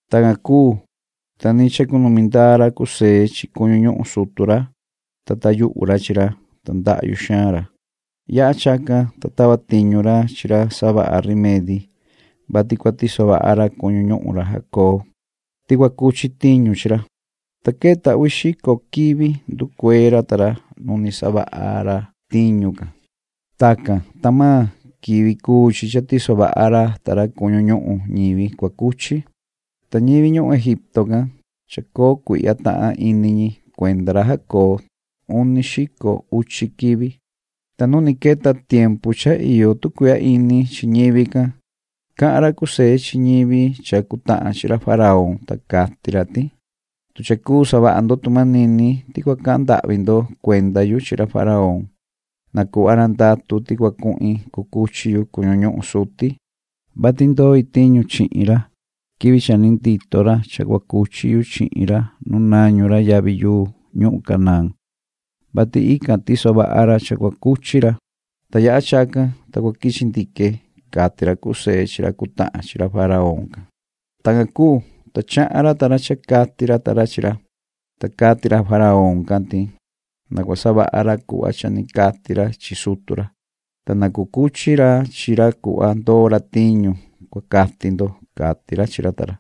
Tacan cuu, ta ni chacunumi ndaa ra José chi cuñu ñuhun sutu ra, ta tayuhu ra chi ra, ta ndahyu xaan ra. Yaha chacan, ta tava tiñu ra chi ra savaha rimedi, vati cua tiso vaha ra cuñu ñuhun ra Jacob ti cua cuchi tiñu chi ra. Ta queta uvi xico quivi nducuee ra ta ra nu ni savaha ra tiñu can. Tacan, ta maan quivi cuu chi cha tiso vaha ra ta ra cuñu ñuhun ñivi cua cuchi. Ta ñivi ñuhun Egipto can, chacoo cuihya tahan ini ñi cuenda ra Jacob uni xico uchi quivi. Ta nu ni queta tiempu cha iyo tu cuihya ini chi ñivi can, cahan ra José chi ñivi cha cutahan chi ra faraón, ta cati ra ti: ―Tu cha cuu savaha ndo tu manini ti cua cahan ndahvi ndo cuenda yu chi ra faraón, na cuhva ra ndatu ti cua cuhin cucuchi yu cuñu ñuhun suti, vati ndoi tiñu chihin ra quivi cha ni ndito ra cha cua cuchi yu chihin ra nu nañu ra yavi yuu ñuhun Canaán, vati ican tiso vaha ra cha cua cuchi ra. Ta yaha chacan, ta cua quichi ndique ―cati ra José chi ra cutahan chi ra faraón can. Tacan cuu, ta chahan ra ta ra cha cati ra ta ra chi ra. Ta cati ra faraón can ti: ―Na cua savaha ra cuhva cha ni cati ra chi sutu ra, ta na cucuchi ra chi ra cuhva ndoo ra tiñu, cua cati ndo ―cati ra chi ra ta ra.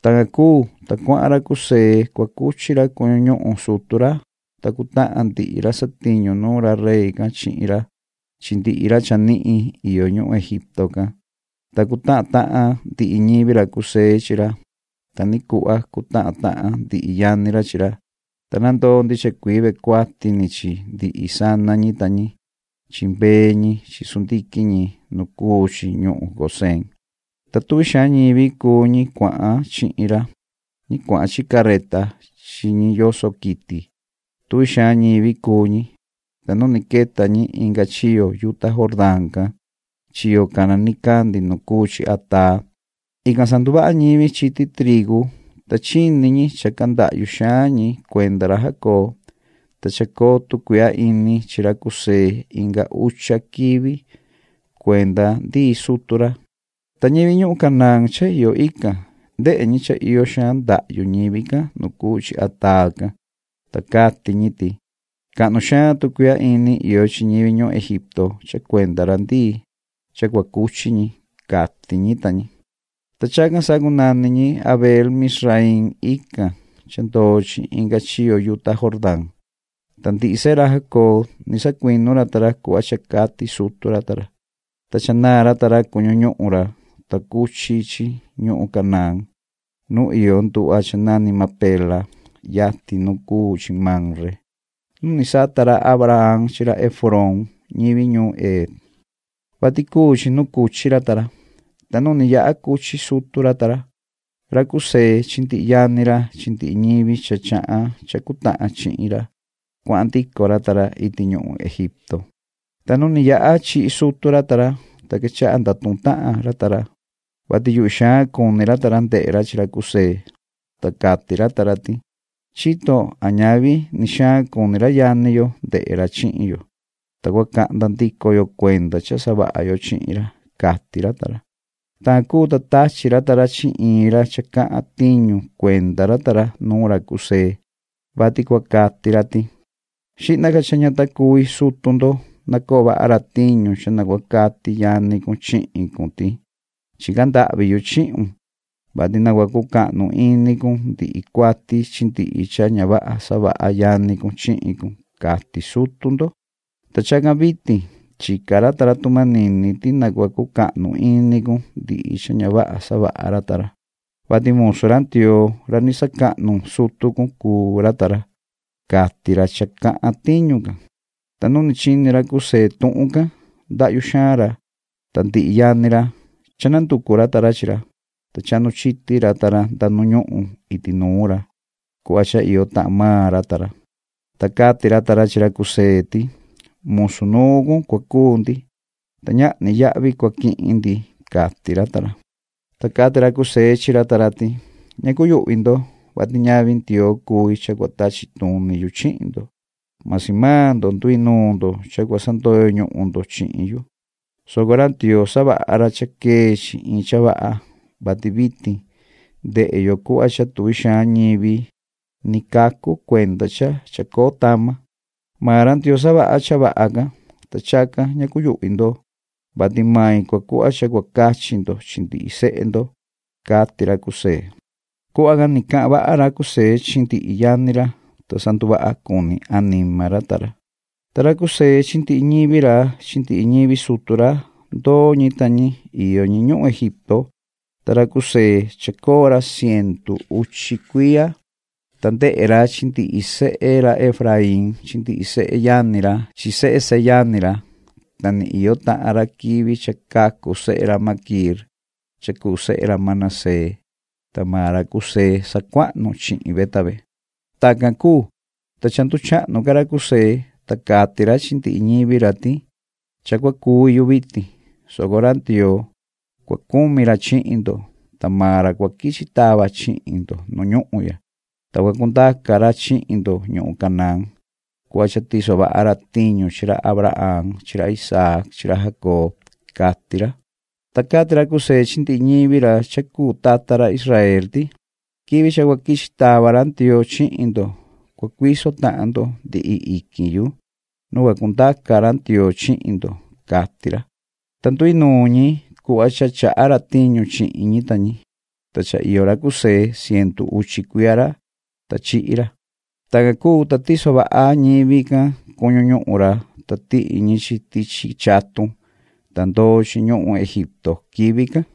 Tacan cuu, ta cuahan ra José cua cuchi ra cuñu ñuhun sutu ra, ta cutahan ndihi ra satiñu nuun ra rey can chihin ra chi ndihi ra chanihin iyo ñuhun Egipto can. Ta cutahan tahan ndihi ñivi ra José chi ra, ta ni cuhva cutahan tahan ndihi yani ra chi ra. Ta nandoo ndicha cuii ve cuati ni chi mbee ñi chi chivu ñi chi sundiquin ñi nu cuu chi ñuhun Gosén. Ta tuvi xaan ñivi cuu ñi cuahan chihin ra, ñi cuahan chi carreta chi ñi yoso quiti. Tuvi xaan ñivi cuu ñi. Ta nu ni queta ñi inga chiyo yuta Jordán can chiyo cana nicandi nu cuu chi Ataad, ican sanduvaha ñivi chiti trigu, ta chini ñi cha candahyu xaan ñi cuenda ra Jacob, ta chacoo tu cuihya ini chi ra José inga ucha quivi cuenda ndii sutu ra. Ta ñivi ñuhun Canaán cha iyo ican, ndehe ñi cha iyo xaan ndahyu ñivi can nu cuu chi Ataad can, ta cati ñi ti: “¡Cahnu xaan tu cuihya ini iyo ñivi ñuhun Egipto cha cuenda ra ndii cha cua cuchi ñi!”, cati ñi ta ñi. Ta chacan sacunani ñi Abeel-mizraiim ican cha ndoo chi inga chiyo yuta Jordán. Ta ndihi sehe ra Jacob, ni sacuinu ra ta ra cuhva cha cati sutu ra ta ra, cha cha naan ra ta ra cuñu ñuhun ra, ta cuchi chi ñuhun Canaán nu iyo nduhva cha nani Macpela yatin nu cuu chi Mamre nu ni sata ra Abraham chi ra Efrón ñivi ñuun Het, vati cuu chi nu cuchi ra ta ra. Ta nu ni yaha cuchi sutu ra ta ra, ra José chi ndihi yani ra chi ndihi ñivi cha chahan cha cutahan chihin ra, cuahan ndico ra ta ra iti ñuhun Egipto. Ta nu ni yaha chihi sutu ra ta ra, ta quechaha ndatuhun tahan ra ta ra, vati yuhvi xaan cuni ra ta ra ndehe ra chi ra José, ta cati ra ta ra ti: “Chito a ñavi ni xaan cuni ra yani yo ndehe ra chihin yo, ta cua cahnda ndico yo cuenda cha savaha yo chihin ra”, cati ra ta ra. Tacan cuu, ta tachi ra ta ra chi iin ra cha cahan tiñu cuenda ra ta ra nuun ra José, vati cua cati ra ti: “Xihna ca cha ña ta cuvi sutu ndo nacoo vaha ra tiñu cha na cua cati yani cun chihin cun ti: ‘Chica ndahvi yu chihun, vati na cua cucahnu ini cun ndihi cuati chi ndihi cha ña vaha savaha yani cun chihin cun’, cati sutu ndo. Ta chacan vitin, chica ra ta ra tu manini ti na cua cucahnu ini cun ndihi cha ña vaha savaha ra ta ra, vati musu ra Ndioo ra ni sacahnu sutu cun cuu ra ta ra”, cati ra cha cahan tiñu can. Ta nu ni chini ra José tuhun can ndahyu xaan ra. Ta ndihi yani ra, cha nanducu ra ta ra chi ra, ta chahnu chiti ra ta ra nda nu ñuhun iti nuun ra, cuhva cha iyo tahan maan ra ta ra, ta cati ra ta ra chi ra José ti: ―Musu nuun cun cua cuu ndi, ta ñahni yahvi cua quihin ndi ―cati ra ta ra. Ta cati ra José chi ra ta ra ti: ―Ña cuyuhvi ndo, vati ñavi Ndioo cui cha cua tachi tuni yu chihin ndo, masi maan ndo, nduinuun ndo cha cua sandoyo ñuhun ndo chihin yu, soco ra Ndioo, savaha ra cha quee chi iin cha vaha, vati vitin ndehe yo cuhva cha tuvi xaan ñivi ni cacu cuenda cha chacoo tama. Maan ra Ndioo savaha cha vaha can. Ta chacan ña cuyuhvi ndo, vati mai cua cuhva cha cua cachi ndo chi ndihi sehe ndo ―cati ra José. Cuhva can ni cahan vaha ra José chi ndihi yani ra, ta sa nduvaha cuni anima ra ta ra. Ta ra José chi ndihi ñivi ra chi ndihi ñivi sutu ra, ndoo ñi ta ñi iyo ñi ñuhun Egipto. Ta ra José chacoo ra cientu uchi cuiya, ta ndehe ra chi ndihi sehe ra Efraín chi ndihi seyani ra chi sehe seyani ra, ta ni iyo tahan ra quivi cha cacu sehe ra Maquiir cha cuu sehe ra Manasés, ta maan ra José sacuahnu chihin ve ta ve. Tacan cuu, ta cha nduchahnu ca ra José, ta cati ra chi ndihi ñivi ra ti: “Cha cua cuvi yu vitin, soco ra Ndioo, cua cumi ra chihin ndo, ta maan ra cua quichi tava chihin ndo nu ñuhun ya, ta cua cundaca ra chihin ndo ñuhun Canaán cuhva cha tiso vaha ra tiñu chi ra Abraham chi ra Isaac chi ra Jacob”, cati ra. Ta cati ra José chi ndihi ñivi ra cha cuu tata ra Israel ti:” Quivi cha cua quichi tava ra Ndioo chihin ndo cua cuiso tahan ndo ndihi iquin yu nu cua cundaca ra Ndioo chihin ndo”, cati ra. Ta nduinuun ñi cuhva cha chaha ra tiñu chihin ñi ta ñi. Ta cha iyo ra José cientu uchi cuiya ra, ta chihi ra. Tacan cuu, ta tiso vaha ñivi can cuñu ñuhun ra, ta tihi ñi chi tichi chatun, ta ndoo chi ñuhun Egipto quivi can.